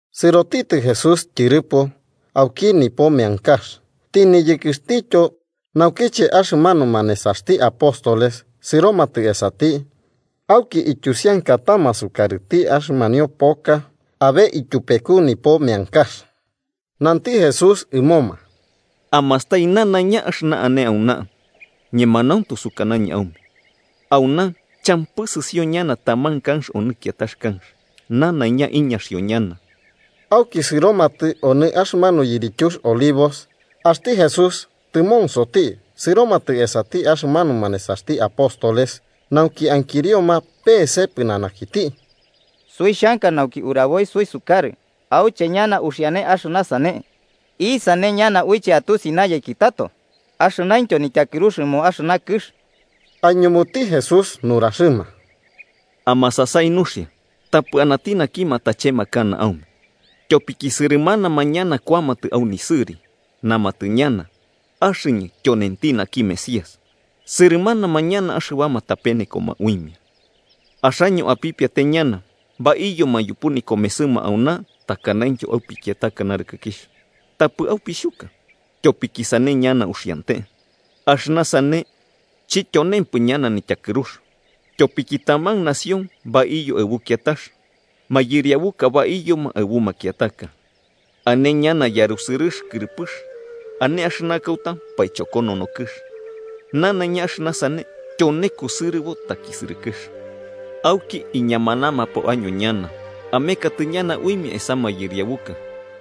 Sɨrotitɨ Jesús tyɨrɨpo auki nipo meankax, tɨniyɨkɨxtityo, naukiche axɨmanuma nesaxti apóstoles sɨromatɨ esati auki ityusiankatama sukarɨti axɨmanio poka abe ityupeku nipo meankax. Nanti Jesús ɨmoma: –¿Amastai nanaiña axɨna ane auna? Ñemanauntu sukanañɨ aume auna champɨ sɨsio ñana taman kanx onɨ kiatax kanx. Nanaiña iñaxio ñana. Auki sɨromatɨ onɨ axɨmanu yirityux Olivos. Axti Jesús tɨmonsoti, sɨromatɨ esati axɨmanuma nesaxti apóstoles nauki ankirioma peese pɨnanakiti: –Suixhanka nauki uraboi suisukarɨ auche ñana uxiane axɨna sane. ¿Isane ñana uiche atusi nayeki tato axɨnaintyo nityakɨrux ɨmo axɨna kɨx? Aiñumuti Jesús nuraxɨma: –Amasasai nuxia tapɨ anati naki matachemakana aume. Tyopiki sɨrɨmanama ñana kuamatɨ au nisɨri. Namatɨ ñana: ‘Axɨñɨ tyonenti naki Mesías’, sɨrɨmanama ñana axɨbama tapenekoma uimia. Axaño apipiate ñana baiyoma yupu nikomesɨma auna takanaintyo au pikiataka narɨkɨkixh. Tapɨ aupixhuka, tyopiki sane ñana uxiante. Axɨna sane chityonempɨ ñana nityakɨrux. Tyopiki taman nación baiyo aɨbu kiatax mayɨriabuka baiyoma aɨbu makiataka. Ane ñana yarusɨrɨx kɨrɨpɨx ane axɨna kauta paichokonono kɨx. Nanaiña axɨna sane tyone kusɨrɨbo takisɨrɨkɨx. “Auki iñamanamapo año ñana, ameketɨ ñana uimia esa mayɨriabuka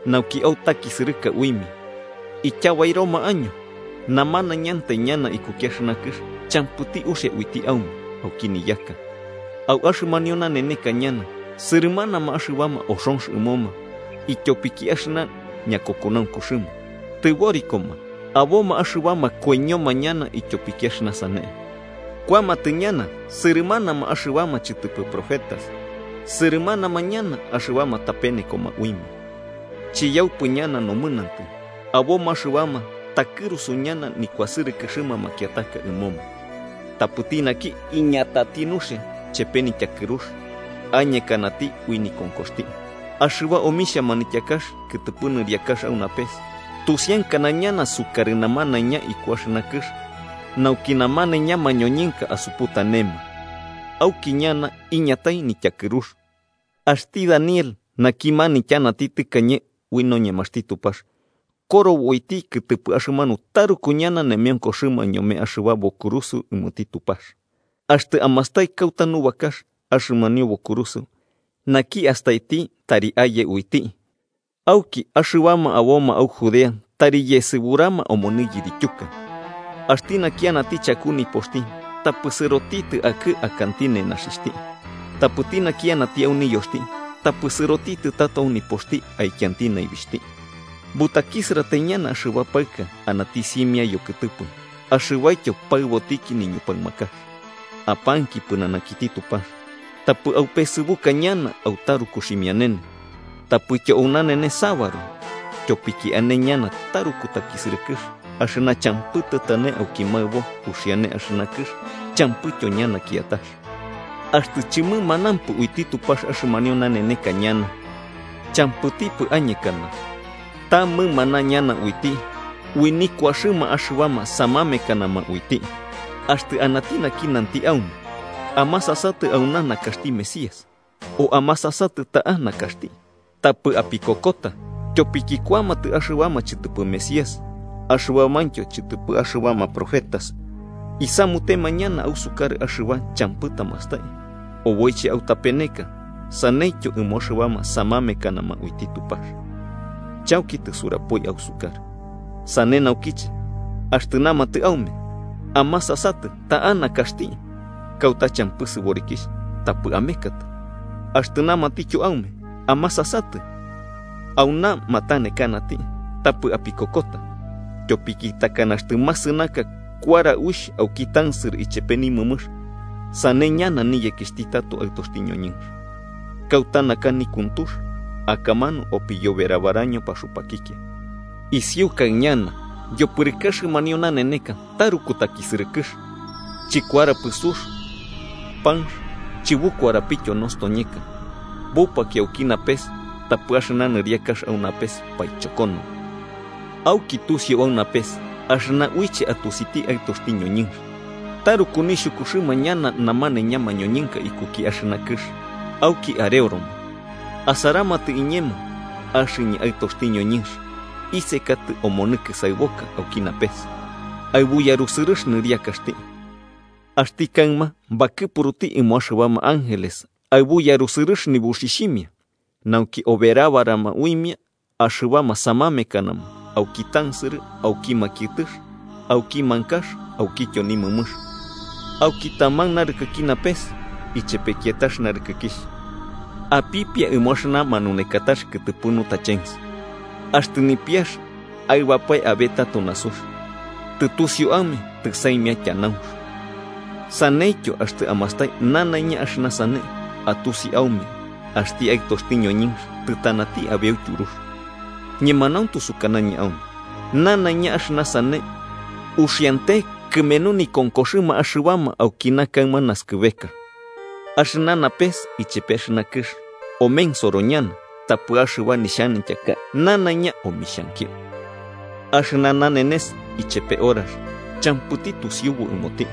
nauki autakisɨrɨka uimia. Ityabairoma año, namanaiñantai ñana ikuki axɨna kɨx champɨti uxia uiti aume auki niyaka. Au axɨmanio naneneka ñana sɨrɨmanama axɨbama oxonx ɨmoma ityopiki axɨna ñakokonaunkuxɨma, tɨborikoma aboma axɨbama koiñoma ñana ityopiki axɨna sane. Kuamatɨ ñana sɨrɨmanama axɨbama chɨtɨpɨ profetas, sɨrɨmanama ñana axɨbama tapenekoma uimia. Chiyaupɨ ñana nomɨnantɨ, aboma axɨbama takɨrusu ñana nikuasɨrɨkɨxɨma makiataka ɨmoma. Tapɨti naki iñatati nuxia chepe nityakɨrux, añekanati ui nikonkoxti. Axɨba omixha manityakax kɨtɨpɨ nɨriakax au napes tusiankana ñana sukarɨ namanaiña iku axɨna kɨx, nauki namanaiña mañoñɨnka asuputanema. Auki ñana iñatai nityakɨrux. “Axti Daniel naki manityanati tɨkañe ui noñemaxti Tupax korobo uiti kɨtɨpɨ axɨmanu taruku ñana nemeonkoxɨma ñome axɨba bokurusɨo ɨmoti Tupax. Axtɨ amastai kauta nubakax axɨmanio Bokurusɨo–naki astaiti, tari aye uiti–, auki axɨbama aboma au Judea tari yesɨburama omonɨ yirityuka. Axti naki anati chaku nipoxti, tapɨ sɨrotitɨ akɨ akanti nenaxixhti. Tapɨti naki anati au niyoxti, tapɨ sɨrotitɨ tato au nipoxti akianti naibixhti. ¡Butakisɨratai ñana axɨba paɨka anati simia yokɨtɨpɨ axɨbaityo paɨbotiki niñupaɨmakax! Apanki pɨnanakiti Tupax tapɨ aupesɨbuka ñana au taruku ximianene tapɨtyo au nanenes sabaru. Tyopiki ane ñana taruku takisɨrɨkɨx axɨna champɨ tɨtane auki maɨbo uxiane axɨna kɨx champɨityo ñana kiatax. Axtɨ chɨmɨmanampɨ uiti Tupax axɨmanio naneka ñana, champɨtipɨ añekana. Ta mɨmana ñana uiti ui nikuaxɨma axɨbama samamekanama uiti. “Axtɨ anati naki nanti aume: ‘Amasatɨ, auna nakaxti Mesías’, o ‘Amasasatɨ, ta'a nakaxti’, tapɨ apikokota. Tyopiki kuamatɨ axɨbama chɨtɨpɨ Mesías axɨbamaintyo chɨtɨpɨ axɨbama profetas. Isamutema ñana ausukarɨ axɨba champɨ tamastai, oboiche autapeneka, saneityo ɨmo axɨbama samamekanama uiti Tupax. Chauki tisurapoi ausukarɨ. Sane naukiche, axtɨ namatɨ aume: ‘Amasasatɨ ta'a nakaxti, kauta champɨ sɨborikixh’, tapɨ amekatɨ. Axtɨ namatityo aume. ‘Amasasatɨ, auna matanekanati’, tapɨ apikokota. Tyopiki takana axtɨ masɨnaka kuara uixh auki tansɨrɨ ichepe nimɨmɨx, sane ñana niyekixhti tato Aɨtoxti ñoñɨnx. Kauta naka nikuntux akamanu opiyoberabaraño paxupakikia. “Isiukai ñana yopɨrɨkɨ axɨmanio naneneka taruku takisɨrɨkɨx, chɨkuarapɨ sux, panx chɨbukuarapityo, nostoñeka bupakio auki napes tapɨ axɨna nɨriakax au napes paichokonono. Auki tusiu au napes axɨna uiche atusiti Aɨtoxti ñoñɨnx, taruku nixhukuxɨma ñana namanaiña mañoñɨnka ikuki axɨna kɨx auki areoroma, asaramatɨ iñemo axɨñɨ Aɨtoxti ñoñɨnx isekatɨ omonɨ kɨsaɨboka auki napes, aɨbu yarusɨrɨx nɨriakaxti. Axti kaɨma bakɨpuruti ɨmo axɨbama ángeles aɨbu yarusɨrɨx nibuxixhimia, nauki oberabarama uimia axɨbama samamekanama auki tansɨrɨ auki makiɨtɨx auki mankax aukityo nimɨmɨx, auki taman narɨkɨki napes ichepe kiatax narɨkɨkixh. “Apipia ɨmo axɨna manunekatax kɨtɨpɨ nutachens: Axtɨ nipiax aɨbapae abe tato nasux, tɨtusiu aume tɨsaimia tyanaunx. Saneityo, axtɨ amastai nanaiña axɨna sane, atusi aume axti Aɨtoxti ñoñɨnx tɨtanati abeu tyurux. Ñemanauntu sukanañɨ aume nanaiña axɨna sane uxiante kɨmenu nikonkoxɨma axɨbama aukina kaɨma naskɨbeka. Axɨna napes ichepe axɨna kɨx omensoro ñana, tapɨ axɨba nixhanityaka nanaiña omixhankio. “Axɨna nanenes ichepe horax, champɨti tusiubu ɨmoti,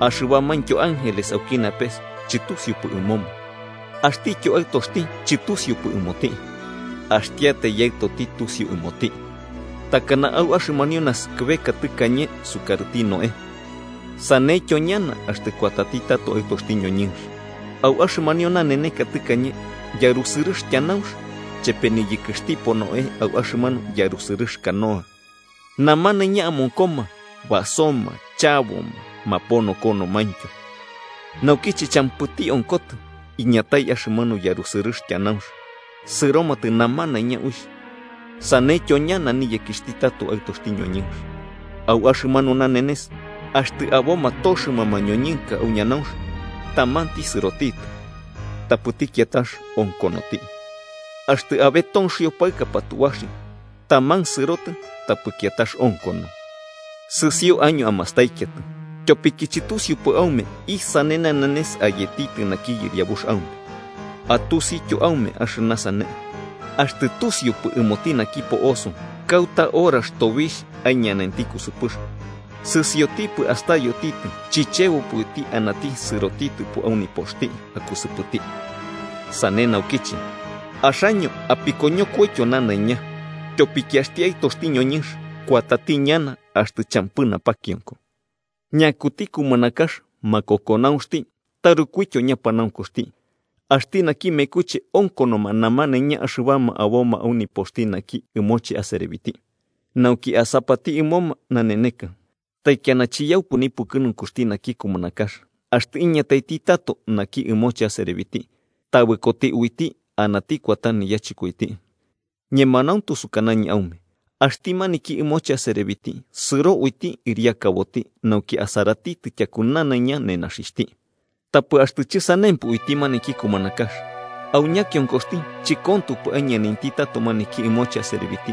axɨbamaintyo ángeles auki napes chɨtusiupɨ ɨmoma, axtityo Aɨtoxti chɨtusiupɨ ɨmoti. Axtiatai Yaɨtoti tusiu ɨmoti. “Takana au axɨmanio naskɨbeka tɨkañe sukarɨti Noé, saneityo ñana axtɨ kuatati tato Aɨtoxti ñoñɨnx. Au axɨmanio naneneka tɨkañe yarusɨrɨx tyanaunx, chepe niyɨkɨxtipo Noé au axɨmanu yarusɨrɨx canoa, namanaiña amonkoma basoma chaboma maponokonomaintyo. Naukiche champɨti onkotɨ, iñatai axɨmanu yarusɨrɨx tyanaunx sɨromatɨ namanaiña uixh. Saneityo ñana niyekixhti tato Aɨtoxti ñoñɨnx. Au axɨmanu nanenes, axtɨ aboma toxɨma mañoñɨnka au ñanaunx, tamanti sɨrotitɨ, tapɨti kiatax onkonoti. Axtɨ abe tonxio paɨka patubaxio, taman sɨrotɨ tapɨ kiatax onkono. “Sɨsio año amastaikiatɨ, tyopiki chɨtusiupɨ aume isane nanenes ayetitɨ naki Yɨriabux aume. Atusityo aume axɨna sane, axtɨ tusiupɨ ɨmoti naki po'oso kauta horax tobixh aiñanainti kusɨpɨx, sɨsiotipɨ astayotitɨ chichebopɨ uiti anati sɨrotitɨpo au nipoxti akusɨpɨti. Sane naukiche, axaño apikoñokoityo nanaiña. Tyopiki axti Aɨtoxti ñoñɨnx kuatati ñana axtɨ champɨ napakionko. “¿Ñakuti kumanakax makokonaunxti tarukuityo ñapanaunkuxti, axti naki mekuche onkonoma namanaiña axɨbama aboma au nipoxti naki ɨmoche aserebiti, nauki asapati ɨmoma naneneka? Taikiana chiyaupɨ nipukɨnunkuxti naki kumanakax axtɨ iñataiti tato naki ɨmoche aserebiti, tabɨkoti uiti anati kuata yachɨkoiti. Ñemanauntu sukanañɨ aume axti maniki ɨmoche aserebiti sɨro uiti ɨriakaboti nauki asaratitɨ tyaku nanaiña nenaxixhti. Tapɨ axtɨ chɨsanempɨ uiti maniki kumanakax, au ñakionkoxti chɨkontopɨ aiñanainti tato maniki ɨmoche aserebiti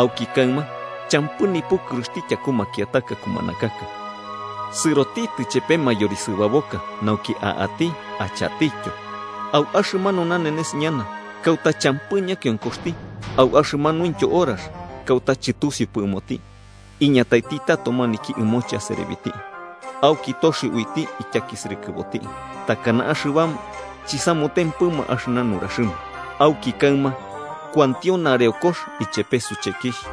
auki kaɨma champɨ nipukɨruxti tyaku makiataka kumanakaka, sɨrotitɨ chepe mayorisɨbaboka nauki a'ati achatityo, au axɨmanu nanenes ñana kauta champɨ ñakionkoxti au axɨmanuintyo horax kauta chɨtusiupɨ ɨmoti, iñataiti tato maniki ɨmoche aserebiti auki toxio uiti ityakisɨrɨkɨboti, takana axɨbama chɨsamutempɨma axɨna nuraxɨma. Auki kaɨma kuantio nareokox ichepe suchekixh.